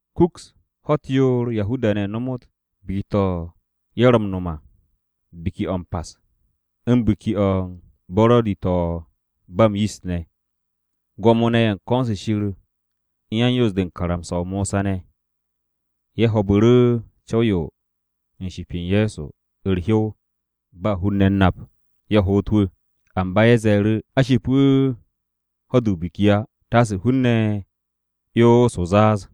Kuks ho̱-u̱t yoor Yahuda-ne̱ nomot biki-to̱ ye̱ ro̱ m-no̱m à Biki-o̱ m-Pas u̱n Biki-o̱ u̱t-Buro̱di to̱ ba m-Yist ne̱. Gwo̱mo-ne̱ ye̱ u̱n ko̱n-se Shir u̱n yan-Yoos-de u̱n karamsa-o Mosa ne̱ ye̱ ho̱o̱bu̱ru̱ co̱w-yo u̱n ship u̱n Ye̱so u̱r-hyow ba hun-ne̱ ye̱ u̱n nap, ye̱ hoot wu̱. Amba ye̱ ze̱e̱ru̱, “A ship wu̱ ho̱-de o-biki á, taase hun-ne̱ 'yons o-zaaz.”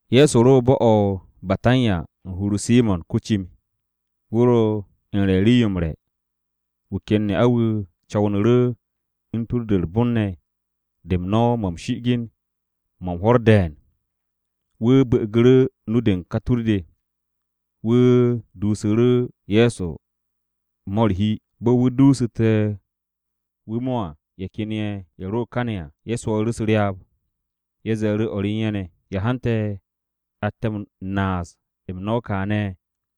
Ye̱so ro bo̱-o̱ o-Betanya u̱n hur-o Simo̱n ko-cim. Wu̱ ro u̱n re̱ u̱n rii-yo m-re̱, wu̱ ken ne'a-wu̱ co̱wnu̱ru̱ u̱n u̱r-batta ne̱ de u̱n no̱w-mo̱ m-shi'igin mo̱ u̱n hwo̱r de̱e̱n. Wu̱ bu̱'u̱gu̱ru̱ nu-de u̱n ka tur-de. Wu̱ duusu̱ru̱ Ye̱so mo̱ u̱r-hi. Bo̱ wu̱ duusu̱te̱ wu̱ mo̱ à, ye̱ ken ye̱, ye̱ ro kane̱ à, ye̱ swooru̱ u̱s-ryaab. Ye̱ ze̱e̱ru̱ o̱r u̱n ye̱ ne̱, “¿Ya hante̱ atte̱ m-naas m-no̱w kaane̱?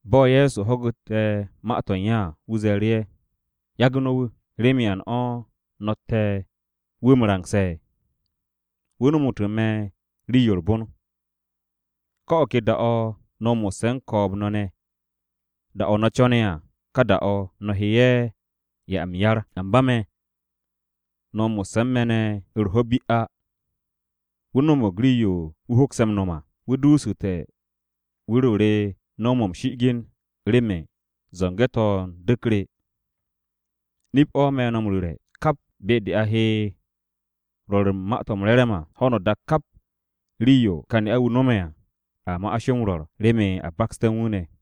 Bo̱ Ye̱so ho̱gu̱te̱ ma-to̱ u̱n ye̱ à, wu̱ ze̱e̱ru̱ ye̱, “Yage̱ no̱ wu̱. ¿Remen yan o̱ no̱tte̱ wu̱ m-rangse̱? Wu̱ nomu̱tu̱ me̱ rii-yo u̱r-bon. Ko̱ o̱ ke da-o̱ no̱ mo̱sse̱ u̱n ko̱o̱b-ne̱ ne̱. Da-o̱ no̱ co̱ne̱ à, ka da-o̱, no̱ he ye̱ m-'ya m-yar. Amba me̱, no̱ mo̱sse̱ u̱n me̱ ne̱ ho̱-u̱r bi á. Wu̱ no̱mo̱g rii-yo wu̱ hokse̱ m-no̱m à. Wu̱ duusu̱te̱ wu̱r-o re no̱w-mo̱ m-shi'igin remen zo̱nge̱-to̱ u̱n du̱k re. Nip-o̱ me̱ no̱ m-ru̱re̱, kap be-de a he rwo̱r u̱n Ma-to̱ m-Re̱re̱m à, ho̱no o-dak kap rii-yo ka ne'a-wu̱ no̱me̱ à, a ma'as yo m-rwo̱r remen a bakste̱ u̱n wu̱ ne̱.”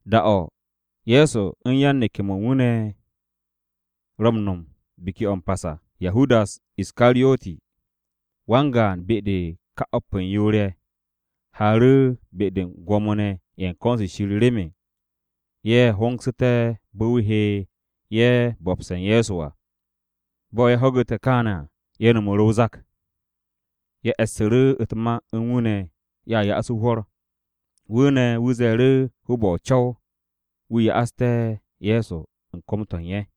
Da-o̱ Ye̱so u̱n yan-neke̱-mo̱ u̱n wu̱ ne̱ ro̱ m-no̱m Biki-o̱ m-Pas à, Yahudas Iskariyoti, wan-gaan be-de u̱n ka o̱p u̱n yoor-ye̱, haaru̱ be-de u̱n Gwo̱mo-ne̱ ye̱ u̱n ko̱n-se Shir remen ye̱ hongsu̱té̱ bo̱ wu̱ he ye̱ bo̱bse̱ u̱n Ye̱so à. Bo̱ ye̱ ho̱gu̱te̱ kaane̱ à, ye̱ no̱mu̱ru̱ o-zak. Ye̱ e̱ssu̱ru̱ u̱t-ma u̱n wu̱ ne̱ ye̱a ya'as wu̱ hwo̱r. Wu̱ ne̱ wu̱ ze̱e̱ru̱ hoob-o̱ o-co̱w wu̱ ya'aste̱ Ye̱so u̱n kom-to̱ u̱n ye̱.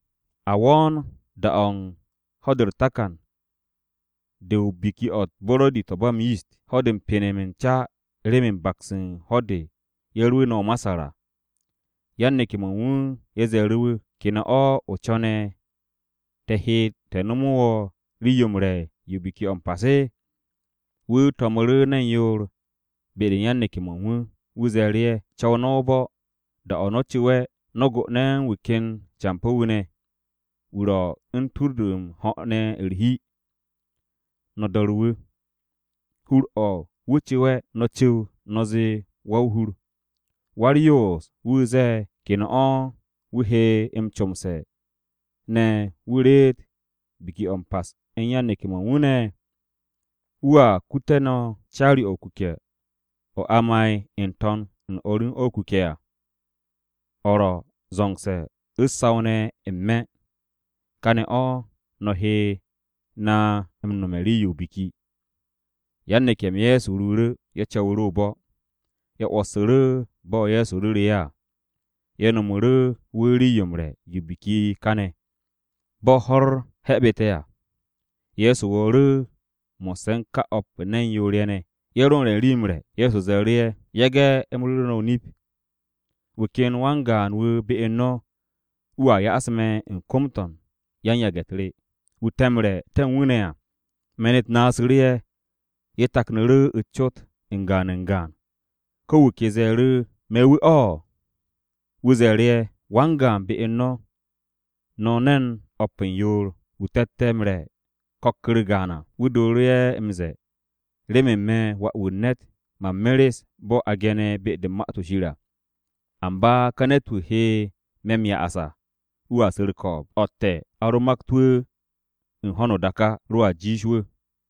A wo̱o̱n da-o̱ u̱n ho̱-de u̱r-takan de Biki-o̱ u̱t-Buro̱di to̱ ba m-Yist, ho̱-de u̱n m-penem u̱n ca remen baks u̱n ho̱-de ye̱ rwu̱u̱nte̱ o-Masar à. Yan-neke̱-mo̱ u̱n wu̱ ye̱ ze̱e̱ru̱ wu̱. “¿Ke ne̱ o̱ o co̱ne̱ te̱ he te̱ nomo wo̱ rii-yo m-re̱ yo Biki-o̱ m-Pas?” Wu̱ to̱mu̱ru̱ ne̱n yoor be-de u̱n yan-neke̱-mo̱ u̱n wu̱. Wu̱ ze̱e̱ru̱ ye̱, “Co̱w no̱ o-bo̱. Da-o̱ no̱ co̱we̱, no̱ go'one̱ u̱n wu̱ ken campo̱-wu̱ ne̱. Wu̱ ro̱ u̱n tur-de m-ho̱ ne̱ u̱r-hi. No̱ do̱re̱ wu̱. Hur-o̱ wu̱ cu̱we̱, no̱ cu̱w no̱ zee wa-o-hur, ‘Wa-u̱r-yoos-wu̱ zee, “¿ke ne̱ o̱ wu̱ he m-comse̱ ne̱ wu̱ reet Biki-o̱ m-Pas u̱n yan-neke̱-mo̱ u̱n wu̱ ne̱?” ’ Wu̱a kute̱ no̱ caari-o̱ o-kuke̱ o̱ a ma'e̱ n-to̱n u̱n o̱r u̱n o̱ o-kuke̱ à. O̱ ro̱ zo̱ngse̱ u̱s-saw ne̱ n-me̱. Káane̱ o̱, no̱ he na m-nome̱ rii-yo o-biki.” Yan-neke̱-m Ye̱so ruuru̱. Ye̱ co̱wu̱ru̱ o-bo̱. Ye̱ 'wo̱ssu̱ru̱ bo̱ Ye̱so ru̱ru̱ ye̱ à. Ye̱ nomu̱ru̱ wu̱ rii-yo m-re̱ yo Biki-o̱ m-Pas káne̱. Bo̱ ho̱-u̱r he̱bu̱te̱ à, Ye̱so wo̱o̱ru̱ mo̱sse̱ u̱n ka o̱p u̱n ne̱n yoor-ye̱ ne̱. Ye̱ ro m-re̱ u̱n rii-yo m-re̱, Ye̱so ze̱e̱ru̱ ye̱, “Nip-o̱ me̱ no̱ m-ru̱re̱. Wu̱ ken wan-gaan-wu̱ be u̱n no̱, wu̱a ya'as me̱ u̱n kom-to̱ u̱n yan-yage̱-u̱t re, wu̱ te̱ m-re̱ te̱ u̱n wu̱ ne̱ à.” Me̱n-u̱t naasu̱ru̱ ye̱, ye̱ taknu̱ru̱ u̱s-cot u̱n gaan u̱n gaan. Ko̱ wu̱ ke wu̱ ze̱e̱ru̱, “¿Me̱ wu̱ o̱?” Wu̱ ze̱e̱ru̱ ye̱, “Wan-gaan be u̱n no̱, no̱ ne̱n o̱p u̱n yoor, wu̱ te̱tte̱ m-re̱ ko̱k-u̱r gaan à. Wu̱ dooru̱ ye̱ m-ze̱e̱, remen me̱ Wà-wu̱ u̱n ne̱t, man meres bo̱ a ge̱ne̱ be-de u̱n Ma-to̱ Shir à. Amba ka ne̱t-wu̱ he me̱ m-ya'as à, wu̱a su̱ u̱r-ko̱o̱b, o̱tte̱ a ro makt wu̱ u̱n ho̱no o-dak á, roa jiish wu̱.”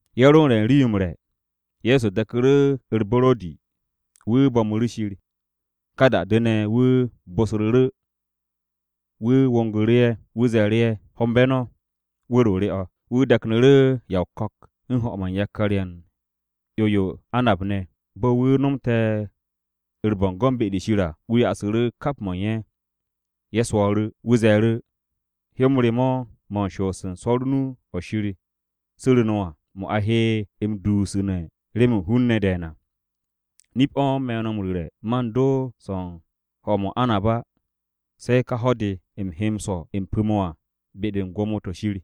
Ye̱ ro u̱n re̱ u̱n rii-yo m-re̱, Ye̱so de̱ku̱ru̱ u̱r-buro̱di, wu̱ bo̱mu̱ru̱ Shir. Ka da-de ne̱, wu̱ bosru̱ru̱, wu̱ wongu̱ru̱ ye̱. Wu̱ ze̱e̱ru̱ ye̱, “Hombe̱ no̱, wu̱r-o re o̱.” Wu̱ de̱knu̱ru̱ ya o-ko̱k u̱n ho̱-mo̱ u̱n yakar-ye̱ u̱n 'yo-yo o-anab ne̱. Bo̱ wu̱ nomte̱ u̱r-bo̱ngo̱n be-de Shir à, wu̱ ya'asu̱ru̱ kap mo̱ u̱n ye̱. Ye̱ swo̱o̱ru̱. Wu̱ ze̱e̱ru̱, “Hyo-m re mo̱ mo̱ u̱n shoos u̱n swo̱r o-nu o̱ Shir su̱ru̱ no̱ à, mo̱ a he m-dusune̱ remen hun-ne̱ de̱e̱n à. Nip-o̱ me̱ no̱ m-ru̱re̱ man do swo̱ u̱n ho̱-mo̱ o-anab á, se̱ ka ho̱-de u̱m he m-swo̱ m-pu̱ mo̱ à, be-de u̱n Gwo̱mo-to̱ Shir à.”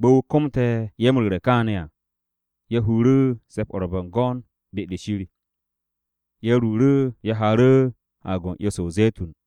Bo̱ wu̱ komte̱ ye̱ m-ru̱re̱ kaane̱ à, ye̱ huru̱ Se̱p-o̱ u̱r-Bo̱ngo̱n de Shir. Ye̱ ruuru̱, ye̱ haaru̱ u̱n Haag-o̱ u̱n 'yo-se o-Ze̱tun.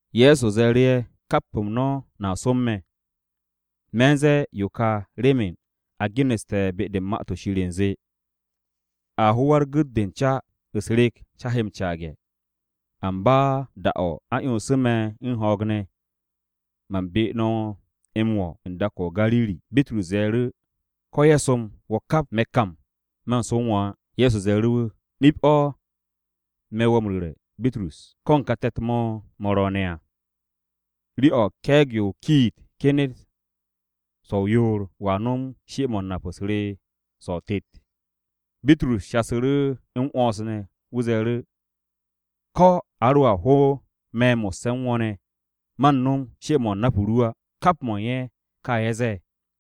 Ye̱so ze̱e̱ru̱ ye̱, “Kap-m no̱ no̱a som me̱. Me̱ u̱n ze̱e̱ yo ka remen a geneste̱ be-de u̱n Ma-to̱ Shir u̱nze: “ ‘A ho wa-u̱r-gu̱t de u̱n ca, u̱s-rek ca he m-caage̱.’ Amba da-o̱ a 'yonsu̱ me̱ u̱n ho̱o̱g ne̱, man be no̱ m-wo̱ u̱n dak-o̱ o-Gariri.” Bitrus ze̱e̱ru̱, “Ko̱ ye̱ som wo̱ kap, me̱ kam man som wo̱ á.” Ye̱so ze̱e̱ru̱ wu̱, “Nip-o̱ me̱ wo̱ m-ru̱re̱, Bitrus, ko̱ u̱n ka te̱t-mo̱ mo̱ ro̱o̱ne̱ à, rii-o̱ ke̱e̱g-yo o-kiit kenet so̱-o yoor, wo̱a nom she-mo̱ u̱n nap-u̱s re so̱ o-tet.” Bitrus shasu̱ru̱ m-'wo̱ns ne̱. Wu̱ ze̱e̱ru̱, “Ko̱ a roa ho me̱ mo̱sse̱ u̱n wo̱ ne̱, man no̱m she-mo̱ u̱n nap-m ru á.” Kap mo̱ u̱n ye̱ ka ye̱ ze̱e̱.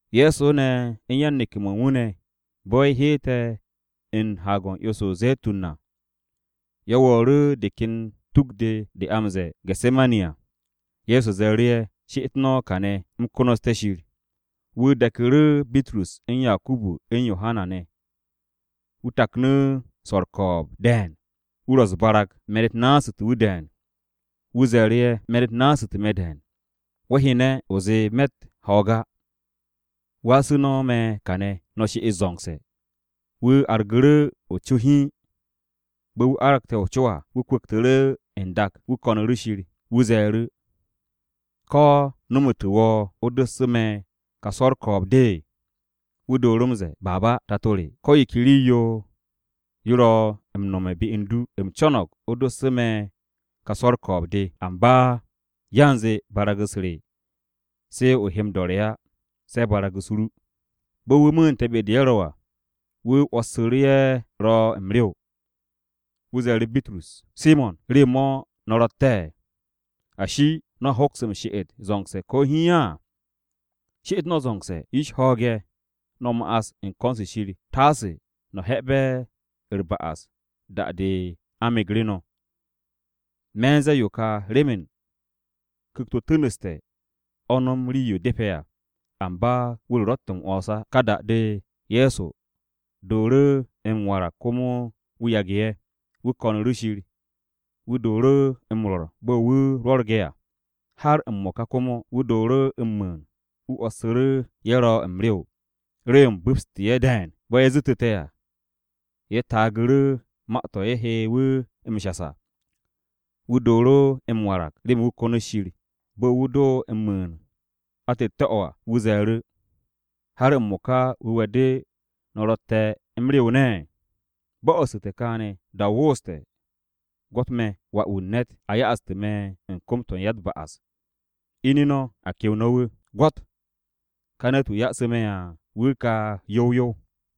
Ye̱so ne̱ u̱n yan-neke̱-mo̱ u̱n wu̱ ne̱, bo̱ ye̱ heete̱ u̱n Haag-o̱ u̱n 'yo-se o-Ze̱tun à, ye̱ wo̱o̱ru̱ de ken tuk-de de a m-ze̱e̱ o-Gese̱mani à. Ye̱so ze̱e̱ru̱ ye̱, “She'et no̱ kàne̱, u̱m konoste̱ Shir.” Wu̱ de̱ku̱ru̱ Bitrus u̱n Yakubu u̱n Yohana ne̱, wu̱ taknu̱ swo̱r u̱r-ko̱o̱b de̱e̱n. Wu̱ ro u̱s-barag, me̱n-u̱t naasu̱te̱ wu̱ de̱e̱n. Wu̱ ze̱e̱ru̱ ye̱, “Me̱n-u̱t naasu̱te̱ me̱ de̱e̱n. Wo̱ hyene̱, o zee me̱tt ho̱o̱g á. Wasu̱ no̱ me̱ kàne̱, no̱ she'et zo̱ngse̱.” Wu̱ argu̱ru̱ co hiin. Bo̱ wu̱ arge̱ o-co à, wu̱ kwu̱ktu̱ru̱ n-dak, wu̱ ko̱nu̱ru̱ Shir. Wu̱ ze̱e̱ru̱, “¿Ko̱ nomu̱tu̱ wo̱ o dossu̱ me̱ ka swo̱ u̱r-ko̱o̱b de?” Wu̱ dooru̱ m-ze̱e̱, “Abba, Tato re, ko̱ yo ke rii-yo yo ro̱ m-nome̱ be u̱n du. U̱m co̱no̱g o dossu̱ me̱ ka swo̱ u̱r-ko̱o̱b de. Amba yanze barag-u̱s re se o he m-do̱re̱ á, se̱ barag-u̱s ru.” Bo̱ wu̱ mu̱u̱nte̱ be-de ye̱ ro à, wu̱ 'wo̱ssu̱ru̱ ye̱ ro̱ m-rew. Wu̱ ze̱e̱ru̱ Bitrus, “¿Simo̱n, rew-mo̱ no̱ ro̱tte̱? Ashi, ¿no̱a hoks m-she'et zo̱ngse̱ ko̱ hiin á? She'et no̱ zo̱ngse̱, yish ho̱o̱ge̱, no̱ ma'as u̱n ko̱n-se Shir, taase no̱ he̱'e̱be̱ u̱r-ba'as da-de a megre̱ no̱. Me̱ u̱n ze̱e̱ yo ka remen ku̱kt-o tu̱nu̱ste̱ o̱ no̱m rii-yo depe̱ à, amba wu̱r-o ro̱tt m-'wo̱ns á.” Ka da-de, Ye̱so dooru̱ m-warag komo wu̱ yage̱ ye̱. Wu̱ ko̱nu̱ru̱ Shir. Wu̱ dooru̱ m-rwo̱r bo̱ wu̱ ro rwo̱rge̱ à. Har m-mo̱ka komo, wu̱ dooru̱ m-mu̱u̱n. Wu̱ 'wo̱ssu̱ru̱ ye̱ ro m-rew. Rew-m bu̱pste̱ ye̱ de̱e̱n. Bo̱ ye̱ zu̱tu̱te̱ à, ye̱ taagu̱ru̱ ma-to̱ ye̱ he wu̱ m-shas à. Wu̱ dooru̱ m-warag remen wu̱ konot Shir. Bo̱ wu̱ do m-mu̱u̱n, o̱ atette̱-o̱ à, wu̱ ze̱e̱ru̱, “¿Har m-mo̱ka wu̱we̱-de no̱ ro̱tte̱ m-rew ne̱? Bo̱'o̱su̱te̱ kaane̱, da-o wooste̱. Gwo̱t me̱ Wà-wu̱ u̱n ne̱t, a ya'astu̱ me̱ u̱n kom-to̱ u̱n ya-u̱t-ba'as. Ine̱ no̱, a kew no̱ wu̱! Gwo̱t! Ká ne̱t-wu̱ ya'asu̱ me̱ à, wu̱ ka yow yow.”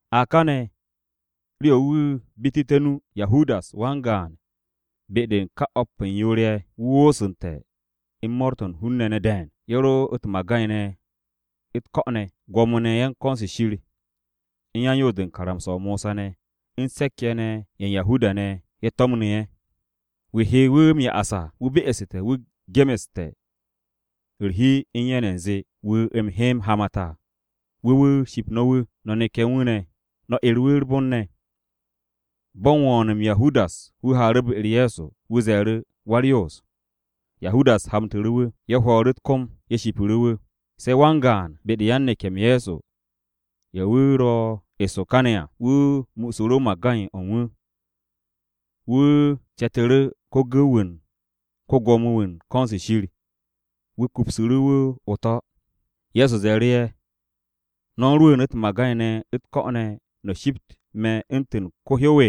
A kane̱, rii-yo wu̱ bitu̱te̱ nu, Yahudas, wan-gaan be-de u̱n ka o̱p u̱n yoor-ye̱, wu̱ woosu̱nte̱ u̱n mo̱o̱r-to̱ u̱n hun-ne̱ ne̱ de̱e̱n. Ye̱ ro u̱t-magay ne̱ u̱t-ko̱ ne̱. Gwo̱mo-ne̱ ye̱ u̱n ko̱n-se Shir, u̱n yan-Yoos-de u̱n karamsa-o Mosa ne̱, u̱n se̱k-ye̱ ye̱ u̱n Yahuda-ne̱, ye̱ to̱mnu̱ ye̱. Wu̱ he wu̱ m-ya'as à, wu̱ be'este̱ wu̱ gemeste̱ u̱r-hi u̱n ye̱ ne̱ u̱nze, “Wu̱ u̱m he m-hamat à wu̱ wu̱ ship no̱ wu̱, no̱ neke̱ u̱n wu̱ ne̱, no̱ 'er wu̱ u̱r-bon ne̱.” Bo̱ u̱n wo̱o̱n-m Yahudas wu̱ haaru̱ be-u̱r Ye̱so, wu̱ ze̱e̱ru̱, “Wa-u̱s-Nap.” Yahudas hamtu̱ru̱ wu̱. Ye̱ hwo̱o̱ru̱ u̱t-kom, ye̱ shipu̱ru̱ wu̱. Se̱ wan-gaan be-de u̱n yan-neke̱-m Ye̱so ye̱ wu̱ ro eso kane̱ à, wu̱ muusu̱ru̱ magay-o̱ u̱n wu̱. Wu̱ ce̱tu̱ru̱ ko-gu̱w-wu̱ u̱n ko-Gwo̱mo-wu̱ u̱n ko̱n-se Shir. Wu̱ kupsu̱ru̱ wu̱ o-to̱. Ye̱so ze̱e̱ru̱ ye̱, “¿No̱ u̱n rwu̱u̱n u̱t-magay ne̱ u̱t-ko̱ ne̱, no̱ shipt me̱ u̱ntu̱n ko-hyow?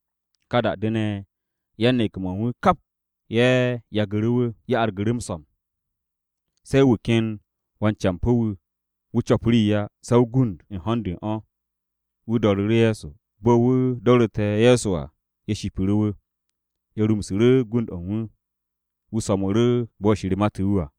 Ka da-de ne̱, yan-neke̱-mo̱ u̱n wu̱ kap ye̱ yagu̱ru̱ wu̱. Ye̱ argu̱ru̱ m-so̱m. Se̱ wu̱ ken wan-campo̱ wu̱, wu̱ co̱p rii á se̱ o-gund u̱n ho̱n-de u̱n o̱, wu̱ do̱ru̱ru̱ Ye̱so. Bo̱ wu̱ do̱ru̱te̱ Ye̱so à, ye̱ shipu̱ru̱ wu̱. Ye̱ rumsu̱ru̱ gund-o̱ u̱n wu̱. Wu̱ so̱mu̱ru̱ bo̱ Shir mate̱ wu̱ à.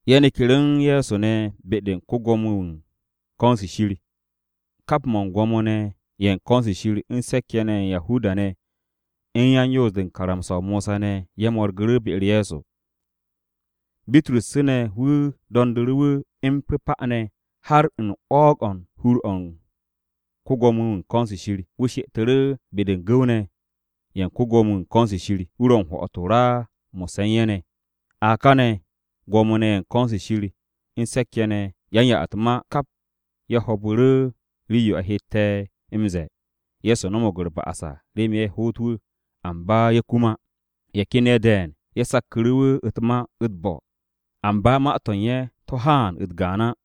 Ye̱ neku̱ru̱ u̱n Ye̱so ne̱ be-de u̱n ko-Gwo̱mo-wu̱ u̱n ko̱n-se Shir. Kap Gwo̱mo-ne̱ ye̱ u̱n ko̱n-se Shir u̱n se̱k-ye̱ ye̱ u̱n Yahuda-ne̱, u̱n yan-Yoos-de u̱n karamsa-o Mosa ne̱ ye̱ mo̱rgu̱ru̱ be-u̱r Ye̱so. Bitrus ne̱ wu̱ do̱ndu̱ru̱ wu̱ m-pu̱pa ne̱ har u̱n 'wo̱o̱g-o̱ u̱n hur-o ko-Gwo̱mo-wu̱ u̱n ko̱n-se Shir. Wu̱ she'etu̱ru̱ be-de u̱n gu̱w-ne̱ ye̱ u̱n ko-Gwo̱mo-wu̱ u̱n ko̱n-se Shir. Wu̱ ro u̱n hwo̱'o̱t o-ra mo̱sse̱ u̱n ye̱ ne̱. A kane̱ Gwo̱mo-ne̱ ye̱ u̱n ko̱n-se Shir u̱n Mo̱ro̱g-de u̱n Se̱k-ye̱ ne̱, yan-ya-u̱t-ma, kap ye̱ ho̱o̱bu̱ru̱ rii-yo a hette̱ m-ze̱e̱ Ye̱so no̱mo̱g u̱r-ba'as à remen ye̱ hoot wu̱, amba ye̱ kum á. Ye̱ ken ye̱ de̱e̱n ye̱ sakku̱ru̱ wu̱ u̱t-ma u̱t-bo̱ amba ma-to̱ u̱n ye̱ to̱ haan u̱t-gaan á.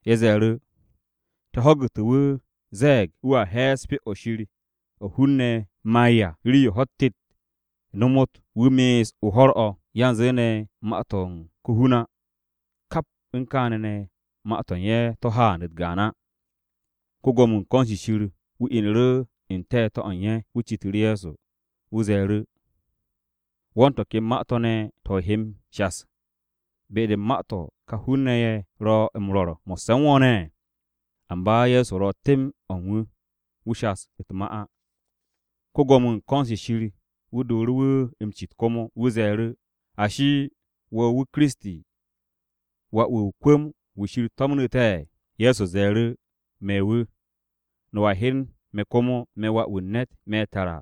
Ye̱ ze̱e̱ru̱. “Te̱ ho̱gu̱te̱ wu̱ ze̱e̱g wu̱a he̱e̱s Pyo-o̱ Shir o̱ hun-ne̱ ma'e̱ à, rii-yo ho̱-u̱t tet nomot wu̱ me'es o ho̱r-o̱, yanze ne̱ ma-to̱ u̱n ko-hun á.” Kap u̱n kaane̱ ne̱, ma-to̱ u̱n ye̱ to̱ haan u̱t-gaan á. Ko-Gwo̱mo-wu̱ u̱n ko̱n-se Shir wu̱ inu̱ru̱ n-te̱te̱ o̱ u̱n ye̱. Wu̱ citu̱ru̱ Ye̱so. Wu̱ ze̱e̱ru̱, “¿Wo̱ u̱n to̱ ken ma-to̱ ne̱ to̱ o he m-shas, be-de u̱n ma-to̱ ka hun-ne̱ ye̱ ro̱ m-rwo̱r mo̱sse̱ u̱n wo̱ ne̱?” Amba Ye̱so ro temb o̱ u̱n wu̱. Wu̱ shas u̱t-ma á. Ko-Gwo̱mo-wu̱ u̱n ko̱n-se Shir wu̱ dooru̱ wu̱ m-cit komo. Wu̱ ze̱e̱ru̱, “Ashi, ¿wo̱ wu̱, Kiristi, Wà-wu̱ u̱n wa-o-kwu̱m-wu̱ Shir to̱mnu̱ te̱?” Ye̱so ze̱e̱ru̱, “Me̱ wu̱. No̱a hyen me̱ komo, me̱ Wà-wu̱ u̱n ne̱t, me̱ tara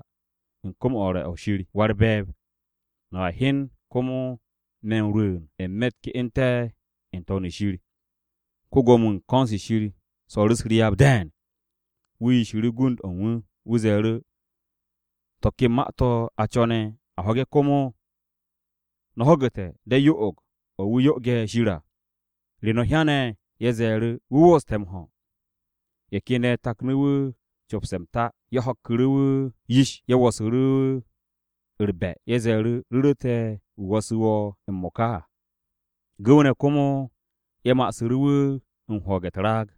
u̱n kom-o̱ u̱r-re̱ o̱ Shir Wa-u̱r-Be̱e̱b. No̱a hyen komo me̱ m-rwu̱u̱n n-me̱ u̱t-ke'ente̱ n-To̱n shir.” Ko-Gwo̱mo-wu̱ u̱n ko̱n-se Shir swo̱o̱ru̱ u̱s-ryaab de̱e̱n. Wu̱ yishu̱ru̱ gund-o̱ u̱n wu̱. Wu̱ ze̱e̱ru̱, “¿To̱ ke ma-to̱ a co̱ne̱ m-ho̱ge̱ komo? No̱ ho̱gu̱te̱ de̱ yo'og-o̱ wu̱ yo'oge̱ Shir à! ¿Re no̱ hyan?” Ye̱ ze̱e̱ru̱, “Wu̱ wooste̱ m-ho̱!” Ye̱ ken ye̱ taknu̱ wu̱ m-copse̱ m-ta. Ye̱ ho̱kku̱ru̱ wu̱ yish, ye̱ wo̱su̱ru̱ wu̱ u̱r-de̱mbe̱. Ye̱ ze̱e̱ru̱, “Ru̱ru̱ te̱ wu̱ wo̱su̱ wo̱ m-mo̱ka à!” Gu̱w-ne̱ komo ye̱ ma'asu̱ru̱ wu̱ u̱n hwo̱o̱ge̱ u̱t-raag.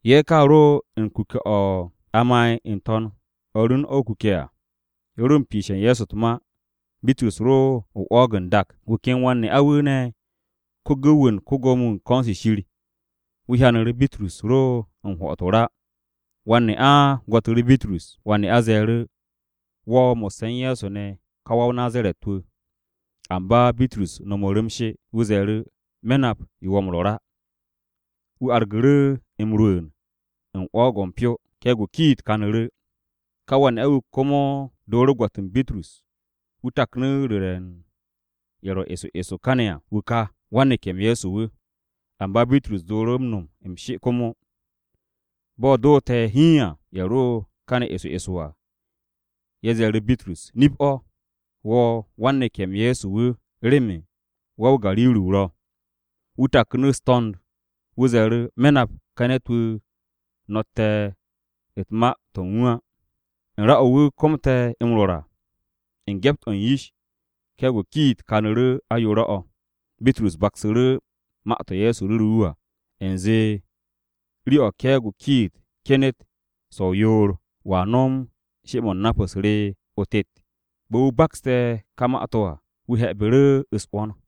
Ye̱ ka ro u̱n kuke̱-o̱ a ma'e̱ n-to̱n u̱n o̱r u̱n o̱ o-kuke̱ à. Ye̱ ro u̱n piishe̱ u̱n Ye̱so u̱t-ma. Bitrus ro o-'wo̱o̱g n-dak. Wu̱ ken wan-ne'a-wu̱ ne̱, ko-gu̱w-wu̱ u̱n ko-Gwo̱mo-wu̱ u̱n ko̱n-se Shir, wu̱ hyanu̱ru̱ Bitrus ro u̱n hwo̱'o̱t o-ra. Wan-ne'a gwo̱tu̱ru̱ Bitrus, wan-ne'a ze̱e̱ru̱, “Wo̱ mo̱sse̱ u̱n Ye̱so ne̱ ka wa-o-Nazaret-wu̱.” Amba Bitrus no̱mu̱ru̱ m-she. Wu̱ ze̱e̱ru̱, “Me̱ nap yo wo̱ rwo̱r á.” Wu̱ argu̱ru̱ m-rwu̱u̱n u̱n 'wo̱o̱g-o̱ u̱n pyo. Ke̱e̱g-o̱ o-kiit kanu̱ru̱. Ka wan-ne'a-wu̱ komo dooru̱ gwo̱t u̱n Bitrus. Wu̱ taknu̱ ru̱re̱ u̱n ye̱ ro eso eso kane̱ à, “Wu̱ ka, wan-neke̱-m Ye̱so wu̱.” Amba Bitrus dooru̱ m-no̱m m-she komo. Bo̱ doote̱ hiin à, ye̱ ro kane̱ eso eso à, ye̱ ze̱e̱ru̱ Bitrus, “Nip-o̱, wo̱ wan-neke̱-m Ye̱so wu̱ remen wa-o-Gariri o ro̱.” Wu̱ taknu̱ u̱s-to̱nd. Wu̱ ze̱e̱ru̱, “Me̱ nap ka ne̱t-wu̱ wu̱ no̱tte̱ u̱n ma-to̱ u̱n wu̱ á.” U̱n ra-o̱ wu̱ komte̱ m-rwo̱r à, u̱n gyept-o̱ u̱n yish, ke̱e̱g-o o-kiit kanu̱ru̱ ayoore̱-o̱. Bitrus baksu̱ru̱ ma-to̱ Ye̱so ru̱ru̱ wu̱ à. U̱nze “rii-o̱ ke̱e̱g-o o-kiit kenet so̱-o yoor, wo̱a nom she-mo̱ u̱n nap-u̱s re so̱ o-tet.” Bo̱ wu̱ bakste̱ ká ma-to̱ à, wu̱ he̱bu̱ru̱ u̱s-'wo̱n.